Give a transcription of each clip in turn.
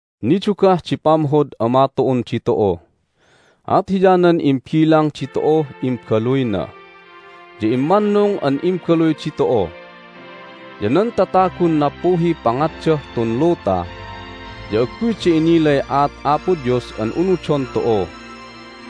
Nidugah di pamhod Ama tu'un ditu'u, at hiyanan imbilang ditu'uh imbaluyna! Ya immannung an imbaluy ditu'u! Ya nan tatagun nappuhiy pangatdah tun luta ya agguyda inilay aat Apo Dios an unudon tu'u,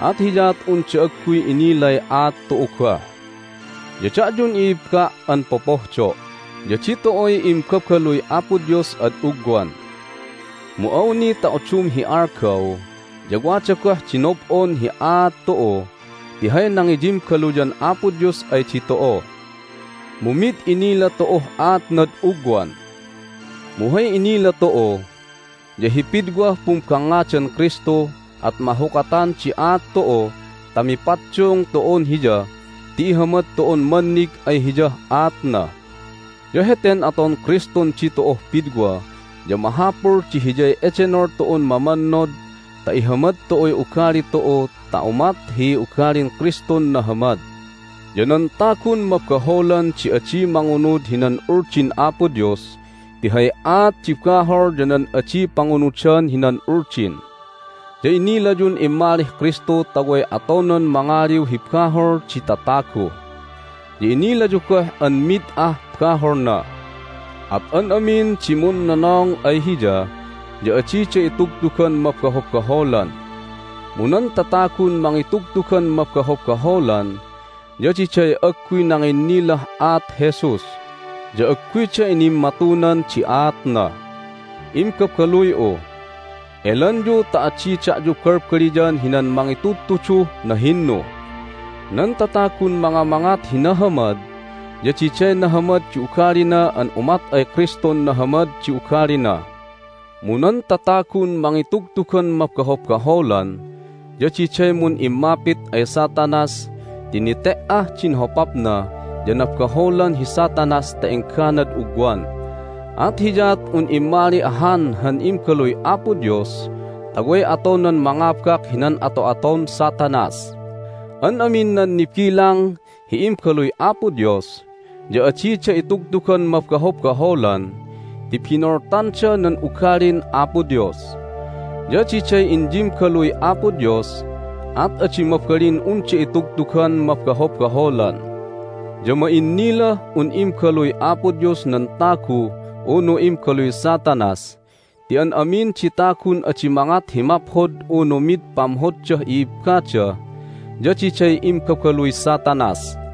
at hiyaat unda agguy inilay aat tu'u goh. Ya da'yun i'ibba' an popohdo' ya ditu'uy imbabaluy Apo Dios ad ugwan. Mu awni ta udum hi algaw ya wada goh di nob'on hi aat tu'u ti hay nangiyimbaluyan Apo Dios ay ditu'u, mu mid inila tu'uh aatnad ugwan. Mu hay inila tu'u ya hi pidwah pumbangngadan Kristu at mahukatan di aat tu'u ta mipaddung tu'un Hiya ti ihamad tu'un mannig ay Hiyah aatna. Ya heten aton Kristun ditu'uh pidwa ya mahapul di hiyay edenol tu'un mamannod ta ihamad tu'uy ugali tu'u ta umat hi ugalin Kristun nahamad. Ya nan tagun mabaholan di adi mangunud hinan Uldin Apo Dios ti hay aat di bahol ya nan adi pangunudan hinan Uldin. Ya inilayun immalih Kristu ta way atonan mangaliw hi bahol di tatagu, ya inilayu goh an mid ah baholna. At an amin di munnonong ay Hiya ya adida itugtugan mabahobaholan. Mu nan tatagun mangitugtugan mabahobaholan ya diday agguy nanginnilah aat Jesus, ya agguyda inimmatunan di aatna. Imbabaluy'u, elanyu ta adi da'yu balbaliyan hinan mangitudtuduh nahinnu! Nan tatagun mangamangat hi nahamad ya diday nahamad di ugalina an umat ay Kristun nahamad di ugalina. Mu nan tatagun mangitugtugan mabahobaholan ya diday mun'immapit ay Satanas ti nete"ah din hopapna ya nabaholan hi Satanas ta engganad ugwan. At hiyaat un immali ahan han Imbaluy Apo Dios ta way atonan mangabak hinan ato'aton Satanas. An amin nan nibilang hi imbaluy Apo Dios ya adida itugtugan mabahobaholan ti binoltanda nan ugalin Apo Dios. Ya diday inyimbaluy Apo Dios, at adi mabalin unda itugtugan mabahobaholan. Ya ma'innilah un imbaluy Apo Dios nan tagu unu imbaluy Satanas ti an amin di tagun adi mangat hi maphod unu mid pamhoddah i'ibbada ya diday imbabaluy Satanas.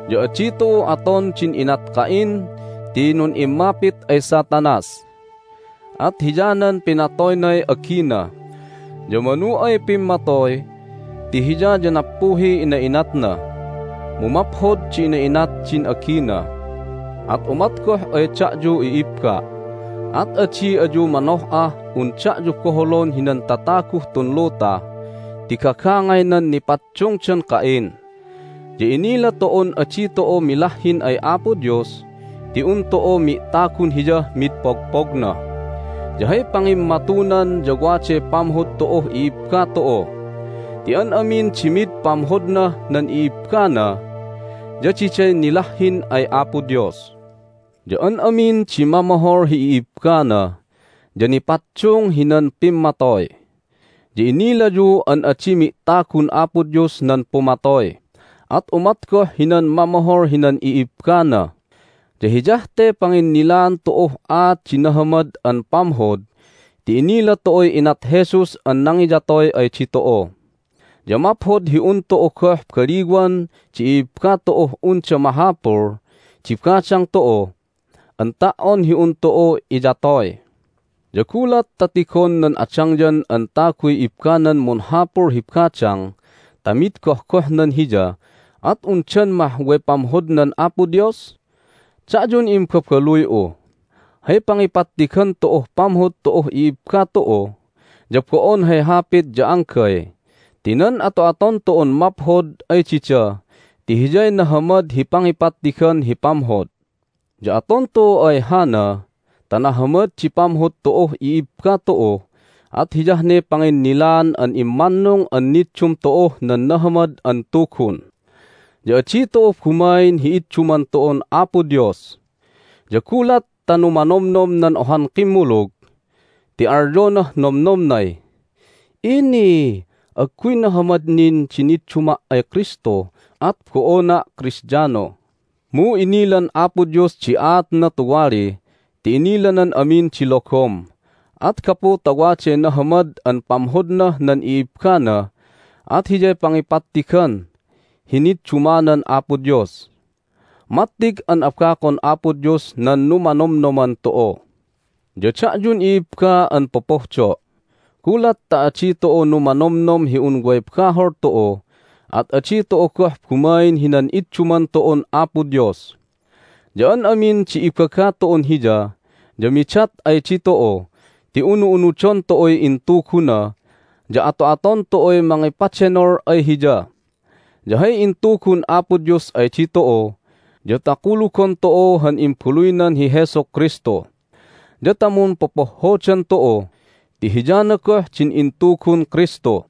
Ya adi tu'u aton din inat Cain ti nun'immapit ay Satanas, at hiyanan pinatoynay agina. Ya manu ay pimmatoy ti hiya ya nappuhiy ina'inatna, mu maphod di ina'inat din agina. At umat goh ay da'yu, i'ibba', at adi ayu manoh'ah un da'yu boholon hinan tataguh tun luta ti gagangaynan nipaddungdan Cain. Ya inila tu'un adi tu'u milahhin ay Apo Dios ti un tu'u mi'tagun Hiyah mid pogpogna, ya hay pangimmatunan ya waday pamhod tu'uh i'ibba tu'u. Ti an amin di mid pamhodnah nan i'ibbana ya diday nilahhin ay Apo Dios. Ya an amin di mamohol hi i'ibbana ya nipaddung hinan pimmatoy, ya inilayu an adi mi'tagun Apo Dios nan pumatoy, at umat goh hinan mamohol hinan i'ibbana. Ya hiyah te panginnilaan tu'uh aat di nahamad an pamhod ti inila tu'uy inat Jesus an nangiyatoy ay ditu'u. Ya maphod hi un tu'u goh baliwan di i'ibba tu'uh unda mahapul di badang tu'u an ta"on hi un tu'u iyatoy! Ya gulat ta tigon nan adangyan an taguy ibbanan munhapul hi badang ta mid gohgohnan hiya at undan mah way pamhodnan Apo Dios? Da'yun imbabaluy'u, hay pangipattigan tu'uh pamhod tu'uh i'ibba tu'u ya bo'on hay hapit ya anggay ti nan ato'aton tu'un maphod ay dida ti hiyay nahamad hi pangipattigan hi pamhod. Ya aton tu'u ay hana ta nahamad di pamhod tu'uh i'ibba tu'u at hiyah ne panginnilaan an immannung an niddum tu'uh nan Nahamad an Tugun, ya adi tu'u bumain hi idduman tu'un Apo Dios. Ya gulat ta numanomnom nan ohan kimmulug ti alyonah nomnomnay, "Ini, agguy nahamad nin di nidduma' ay Kristu, at bo'ona' Kristiano!" mu inilan Apo Dios di aatna tuwali ti inilanan amin di logom, at gapu ta waday nahamad an pamhodnah nan i'ibbana at hiyay pangipattigan hi niddumanan Apo Dios. Mattig an abakon Apo Dios nan numanomnoman tu'u! Ya da'yun i'ibba an popohdo', gulat ta adi tu'u numanomnom hi un way bahol tu'u at adi tu'u goh bumain hinan idduman tu'un Apo Dios. Ya an amin di ibaga tu'un Hiya ya midat ay ditu'u ti unu'unudon tu'uy intuguna, ya ato'aton tu'uy mangipadenol ay Hiya. Ya hay intugun Apo Dios ay ditu'u ya ta kulugon tu'u han Imbaluynan hi Jesu Kristu, ya ta mumpopohhodan tu'u ti hiyana goh din intugun Kristu.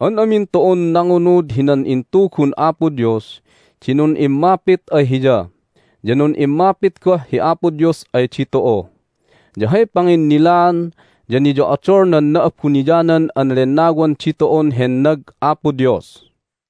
An amin tu'un nangunud hinan intugun Apo Dios di nun'immapit ay Hiya, ya nun'immapit goh hi Apo Dios ay ditu'u. Ya hay panginnilaan ya niyo'odol nan Na'abuniyanan an Lennawan ditu'un hennag Apo Dios.